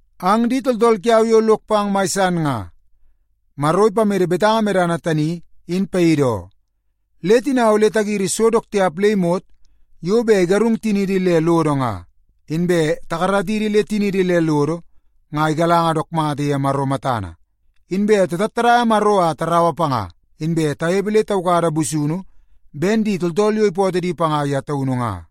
Ang di tooltool kiau yo lok pang mai san nga, Maro ipamede betanga medana tani in paidi oo. Le tina ole tagiri so dook tiap le imot yo bet igarung tiniidi le lodo nga, inbe takaratidi le tiniidi le lodo nga igalanga dook mata ye Maro matana. Inbe tatattadaia Maro a taraua panga, inbe tanepe le taukada busunu ben di tooltool yo ipootoo di panga ye taunu nga.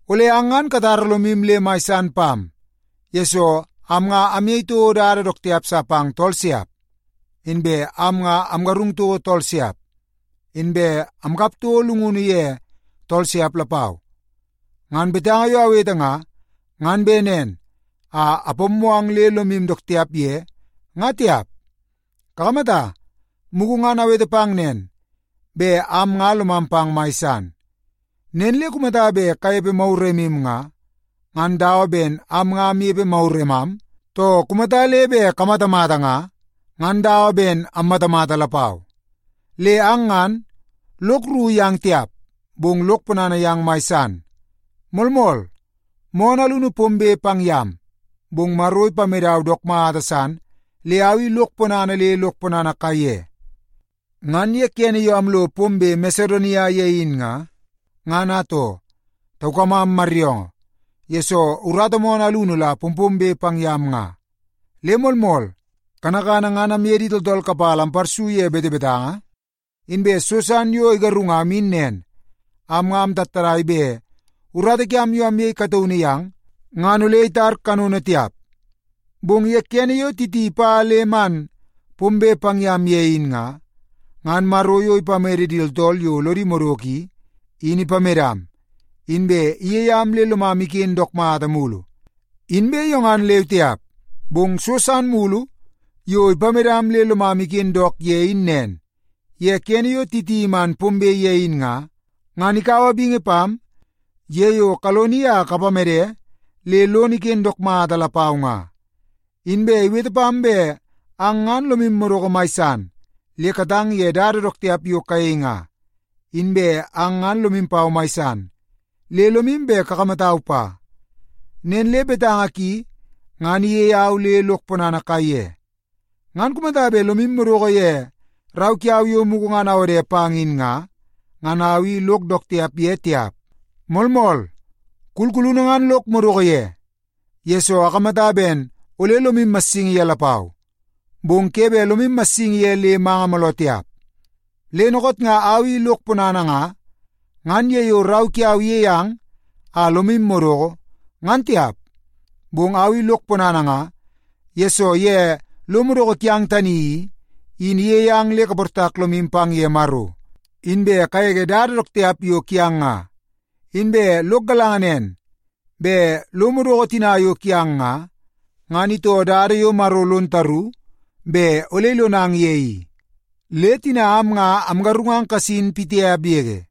Ole ang ngan katara lomu le mai san pam, yesoo am nga amyei toko dada dook tiap sa pang tool siap. Inbe am nga amgarung toko tool siap, inbe amkap toko llungunu ye tool siap lapau. Ngan betanga yo awete nga, ngan bet nen a apammoo ang le lomu dook tiap ye nga tiap. Kakamata, mugu ngan awete pang nen, bet am nga lomam pang mai san. Nen le kumata bet kanepe maguremu nga, ngan am nga dawa ben amnepe maguremam, too kumata le bet kamatamata nga, ngan am nga dawa ben ammatamata lapau. Le ang ngan, lok rru yang tiap, bong lok ponana yang mai san. Moolmool, moonoo alunu pombe pang yam, bong Maro ipamedau dook mata san le au i lok ponana le lok ponana kaiye. Ngan ye kene yo amlo pombe Masedonia ye in nga, ngan atoo, taukamam maryoongoo, yesoo urata moonoo alunu la pompombe pang yam nga. Le moolmool, kanakana ngan amye di tooltool kapala amparsu ye betebetanga, inbe so san yo igarungam in nen, am nga amtattadai bet urata kiam yo amyei kataunu yang, ngan ole itar kanono tiap. Bong ye kene yo Titi ipa le man pombe pang yam ye in nga, ngan Maro yo ipamede di tooltool yo lodi madoko i, in ipamedam, inbe iyei am le lomam iken dook mata mulu. Inbe yo ngan leu tiap, bong so san mulu yo ipamedam le lomam iken dook mata ye in nen, ye kene yo Titi iman pombe ye in nga, ngan ikaua bingi pam ye yo kaloni a kapamede le lono iken dook mata lapau nga. Inbe iwete pam ben ang ngan lomu madoko mai san le katang ye dada dook tiap yo kayei nga, inbe ang ngan lomu pau mai san, le lomu bet kakamatau pa. Nen le betanga ki, ngan iyei au le lok ponana kaiye. Ngan kumata bet lomu madoko ye rau kiau yo mugu ngan awode pang in nga, ngan au i lok dook tiap ye tiap. Moolmool, kulkulunu ngan lok madoko ye, yesoo akamata ben ole lomu massingi ye lapau, bong ke bet lomu massingi ye le manga mooloo tiap. Le dookoot nga au i lok ponana nga, ngan ye yo rau kiau iyei ang a lomu madoko, ngan tiap. Bong au i lok ponana nga, yesoo ye lo madoko kiang tani i, in iyei ang le kaportak lomu pang ye Maro inbe kagege dada dook tiap yo kiang nga. Inbe lok galanga nen bet lo madoko tina yo kiang nga, ngan itoo dada yo Maro lon taru bet ole ilonang ye i. Le tina am nga amgarungang kasin pitiap yege.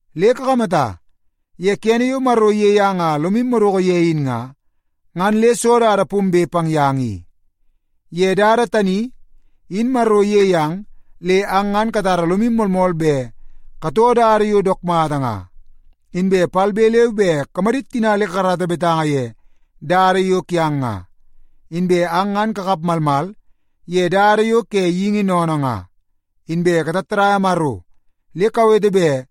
Le kakamata, ye kene yo Maro iyei ang a lomu madoko ye in nga, ngan le soo dada pombe pang yang i? Ye dada tani, in Maro iyei ang le ang ngan katara lomu moolmool bet katoo dada yo dook mata nga, inbe palbe leu be kamadit tina le kakarata betanga ye dada yo kiang nga. Inbe ang ngan kakap malmal ye dada yo ke geingi sennene nga, inbe katattadaia Maro le kawete bet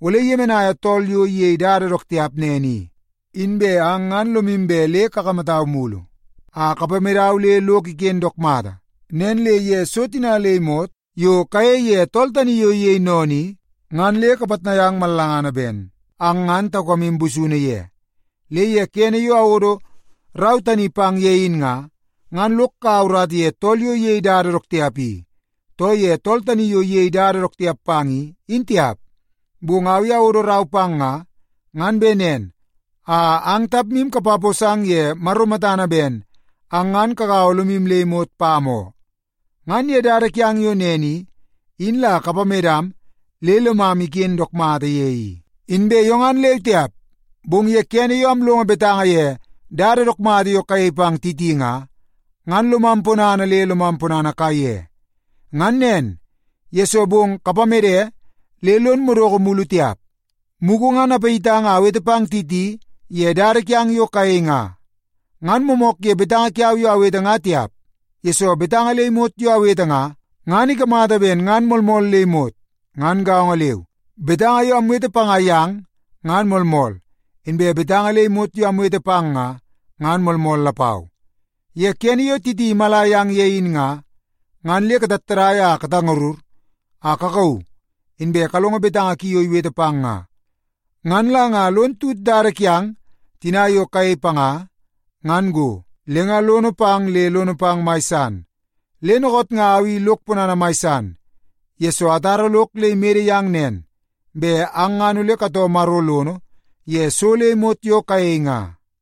ole kayemenaia tool yo iyei dada dook tiap nen i. Inbe ang ngan lomu bet le kakamatau mulu a kapamedau le lok iken dook mata. Nen le ye so tina le imot yo kayei ye tool tani yo iyei sennene i, ngan le kapitnai ang mallangana ben ang ngan taukamu busunu ye. Le ye kene yo awodo rau tani pang ye in nga, ngan lok kaua urata ye tool yo iyei dada dook tiap i, too ye tool tani yo iyei dada dook tiap panga i, in tiap. Bong au i awodo rau pang nga, ngan bet nen a ang tapmu kapaposang ye Maro matana ben ang ngan kagaua lomu le imot pam oo. Ngan ye dada kiang yo nen i, in la kapamedam le lomam iken dook mata ye i. Inbe yo ngan leu tiap, bong ye kene yo amlongo betanga ye dada dook mata yo kayei pang Titi nga, ngan lomam ponana le lomam ponana kaiye. Ngan nen, yesoo bong kapamede le lon madoko mulu tiap. Mugu ngan apayitang a awete pang Titi ye dada kiang yo kayei nga. Ngan moomoonoo ye betanga kiau yo awete nga tiap, yesoo betanga le imot yo awete nga, ngan ikamata ben ngan moolmool le imot. Ngan gaongo leu, betanga yo amwete panga yang ngan moolmool, inbe betanga le imot yo amwete pang nga, ngan moolmool lapau. Ye kene yo Titi imala yang ye in nga, ngan le katattadai a katangarur a kakauu, inbe kalongo betanga ki yo iwete pang nga. Ngan la nga lon tut dada kiang tina yo kayei panga ngan go, le nga lono pang le lono pang mai san. Le dookoot nga au i lok ponana mai san, yesoo atara lok le imede yang nen, bet ang ngan ole katoo Maro lono ye so le imot yo kayei nga.